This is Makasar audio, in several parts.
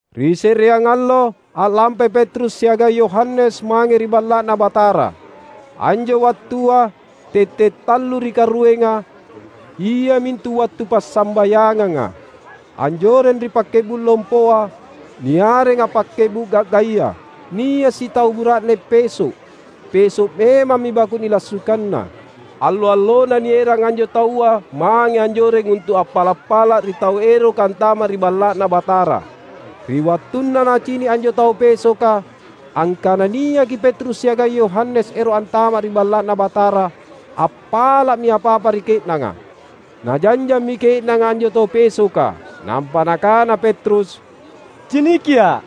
Ri se’reang allo a’lampai Petrus siagang Yohanes mange ri Balla’Na Batara. Anjo wattua tette’ tallu ri karuenga, iamintu wattu passambayanganga. Anjoreng ri pakke’bu’ lompoa, niarenga "Pakke’bu’ Ga’gaya," nia’ sitau bura’ne peso’. Peso’ memammi baku’ nilassukanna. Allo-allona nierang anjo taua mange anjoreng untu’ appala’-pala’ ri tau eroka antama’ ri Balla’Na Batara. Ri wattunna nacini’ anjo tau pesoka angkana niaki Petrus siagang Yohanes ero’ antama’ ri Balla’Na Batara, appala’mi apa-apa ri ke’nanga. Najanjammi ke’nanga anjo tau pesoka, nampa nakana Petrus, "Cinikia’!"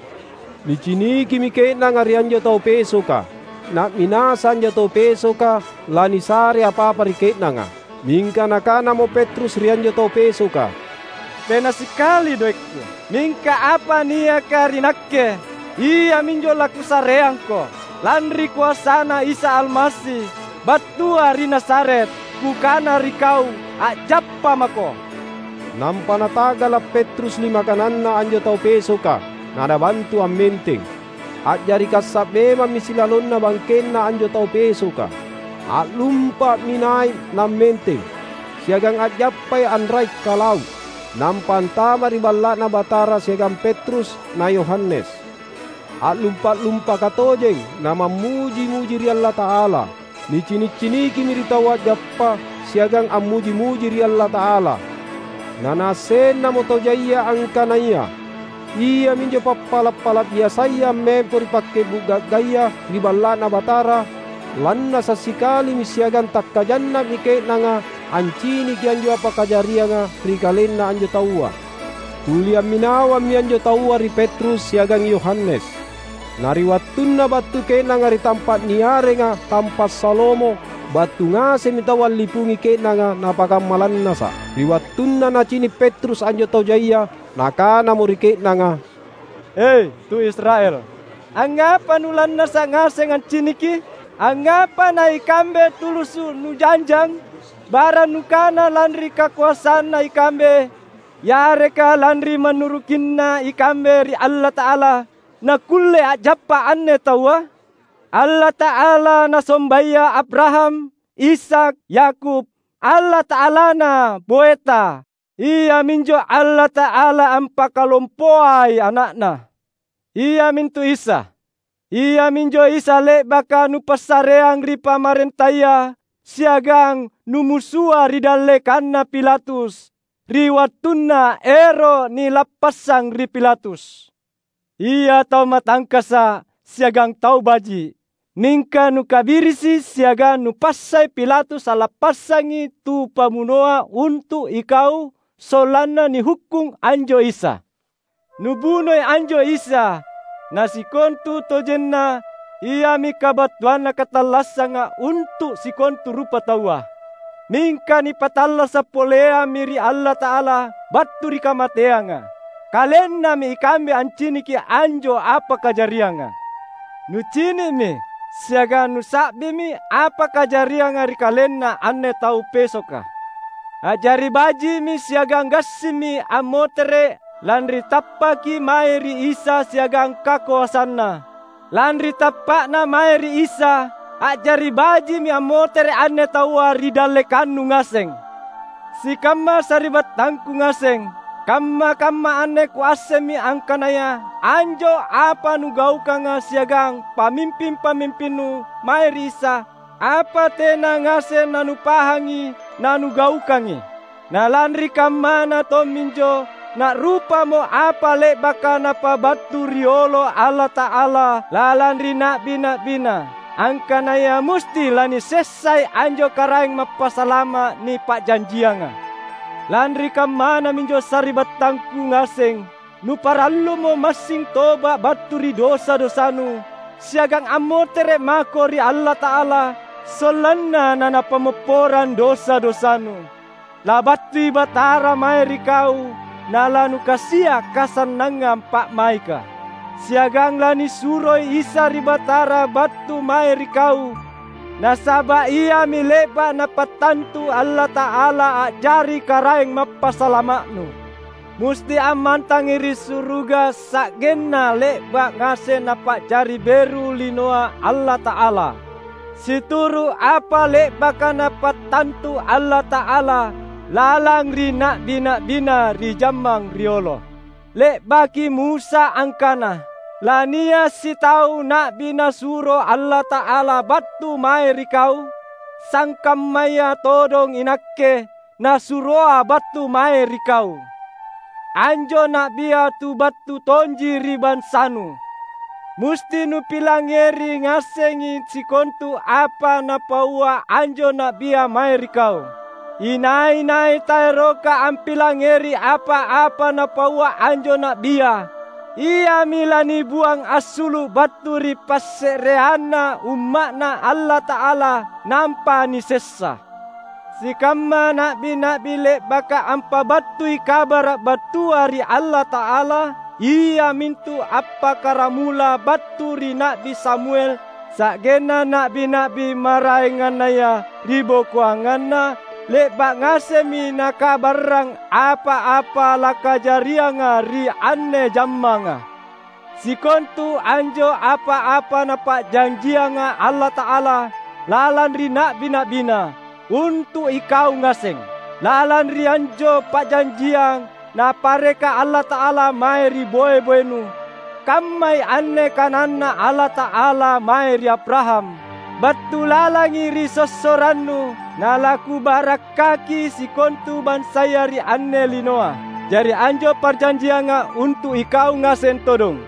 Nicinikimi ke’nanga ri anjo tau pesoka, na’minasa anjo tau pesoka lanisare apa-apa ri ke’nanga. Mingka nakanamo Petrus ri anjo tau pesoka, "Tena sikali doekku. Mingka apa niaka ri nakke, iaminjo lakusareangko: Lanri koasaNa Isa Almasi, battua ri Nazaret, kukana ri kau a’jappa mako!" Nampa nata’gala’ Petrus lima kananna anjo tau pesoka, na nabantu ammenteng. Ajari kassa’ memammi silalonna bangkenna anjo tau pesoka. A’lumpa’mi nai’ nammenteng, siagang a’jappa anrai’-kalau’. Nampa antama’ ri Balla’Na Batara siagang Petrus na Yohanes, a’lumpa’-lumpaka tojeng na mammuji-muji ri Allata’ala. Nicini’-cinikimi ri taua a’jappa’ siagang ammuji-muji ri Allata’ala. Na naassennamo tau jaia angkanaya iaminjo papala’-pala’ biasaya ammempo ri "Pakke’bu’ Ga’gaya" ri Balla’Na Batara. Lannasa’ sikalimi siagang takkajanna’mi ke’nanga anciniki anjo apa kajarianga ri kalenna anjo taua. Tuli amminawammi anjo taua ri Petrus siagang Yohanes. Na ri wattunna battu ke’nanga ri tampa’ niarenga "Tampa’ Salomo," battu ngasemmi taua allipungi ke’nanga napakamma lannasa’. Ri wattunna nacini’ Petrus anjo tau jaia, nakanamo ri ke’nanga, "E, tu Israel, angngapa nulannasa’ ngaseng anciniki? Angngapa naikambe tulusu’ nujanjang? Barang nukana lanri kakoasanna ikambe yareka lanri mannurukinna ikambe ri Allata’ala nakkulle a’jappa’ anne taua? Allata’ala nasombaya Abraham, Ishak, Yakub, Allata’alana boeta, Iaminjo Allata’ala ampakalompoai Ana’Na, iamintu Isa. Iaminjo Isa le’baka nupassareang ri pamarentaya, siagang numusua ri dallekanna Pilatus, ri wattunna ero’ nilappassang ri Pilatus. Ia tau matangkasa’ siagang tau baji’, mingka nukabirisi siagang nupassai Pilatus allappassangi tu pabunoa untu’ ikau sollanna nihukkung anjo Isa. Nubunoi anjo Isa, na sikontutojenna Iami kabattuanna katallassanga untu’ sikontu rupataua. Mingka nipattallasa’ poleammi ri Allata’ala battu ri kamateanga. Kalennami ikambe anciniki anjo apa kajarianga. Nucini’mi siagang nusa’bimi apa kajarianga ri kalenna anne tau pesoka. A’jari baji’mi siagang gassimmi ammotere’ lanri tappaki mae ri Isa siagang kakoasanNa. Lanri tappa’na mae Isa, a’jari baji’mi ammotere’ anne taua ri dallekannu ngaseng. Sikamma sari’battangku ngaseng! Kamma-kamma anne kuassemmi angkanaya anjo apa nugaukanga siagang pamimping-pamimpinnu mae ri Isa, apa tena ngaseng nanupahangi nanugaukangi. Na lanri kammana tomminjo, na’rupamo apa le’baka Napabattu riolo Allata’ala lalang ri na’bi-na’biNa, angkanaya musti lanisessai anjo Karaeng Mappasalama’ nipa’janjianga. Lanri kammana minjo sari’battangku ngaseng, nuparallumo massing toba’ battu ri dosa-dosanu, siagang ammotere’ mako ri Allata’ala sollanna naNapammopporang dosa-dosanu. Labattui Batara mae ri kau nalanukasia’ kasannangang pa’maika. Siagang lanisuroi Isa ri Batara battu mae ri kau, nasaba’ Iami le’ba’ Napattantu Allata’ala a’jari Karaeng Mappasalama’nu. Musti ammantangi ri suruga sa’genna le’ba’ ngaseng Napa’jari beru linoa Allata’ala, situru’ apa le’baka Napattantu Allata’ala lalang ri na’bi-na’biNa ri jammang riolo. Le’baki Musa angkana, ‘Lania’ sitau na’bi Nasuro Allata’ala battu mae ri kau, sangkammaya todong inakke Nasuroa’ battu mae ri kau. Anjo na’bia tu battu tonji ri bansanu. Musti nupilangngeri ngasengi sikontu apa napaua anjo na’bia mae ri kau. Inai-nai taeroka ampilangngeri apa-apa napaua anjo na’bia, iami lanibuang assulu’ battu ri passe’reanna umma’Na Allata’ala nampa nisessa.’ Sikamma na’bi-na’bi le’baka ampabattui kabara’ battua ri Allata’ala, iamintu appakkaramula battu ri Na’bi Samuel sa’genna na’bi-na’bi maraengannaya ribokoanganna, le’ba’ ngasemmi nakabarrang apa-apa lakajarianga ri anne jammanga. Sikontu anjo apa-apa Napa’janjianga Allata’ala lalang ri na’bi-na’biNa, untu’ ikau ngaseng. Lalang ri anjo parjanjiang Napareka Allata’ala mae ri boe-boenu, kammai anne kananNa Allata’ala mae ri Abraham, ‘Battu lalangi ri sossorannu nalaKubarakkaki sikontu bansaya ri anne linoa.’ Jari anjo parjanjianga untu’ ikau ngaseng todong.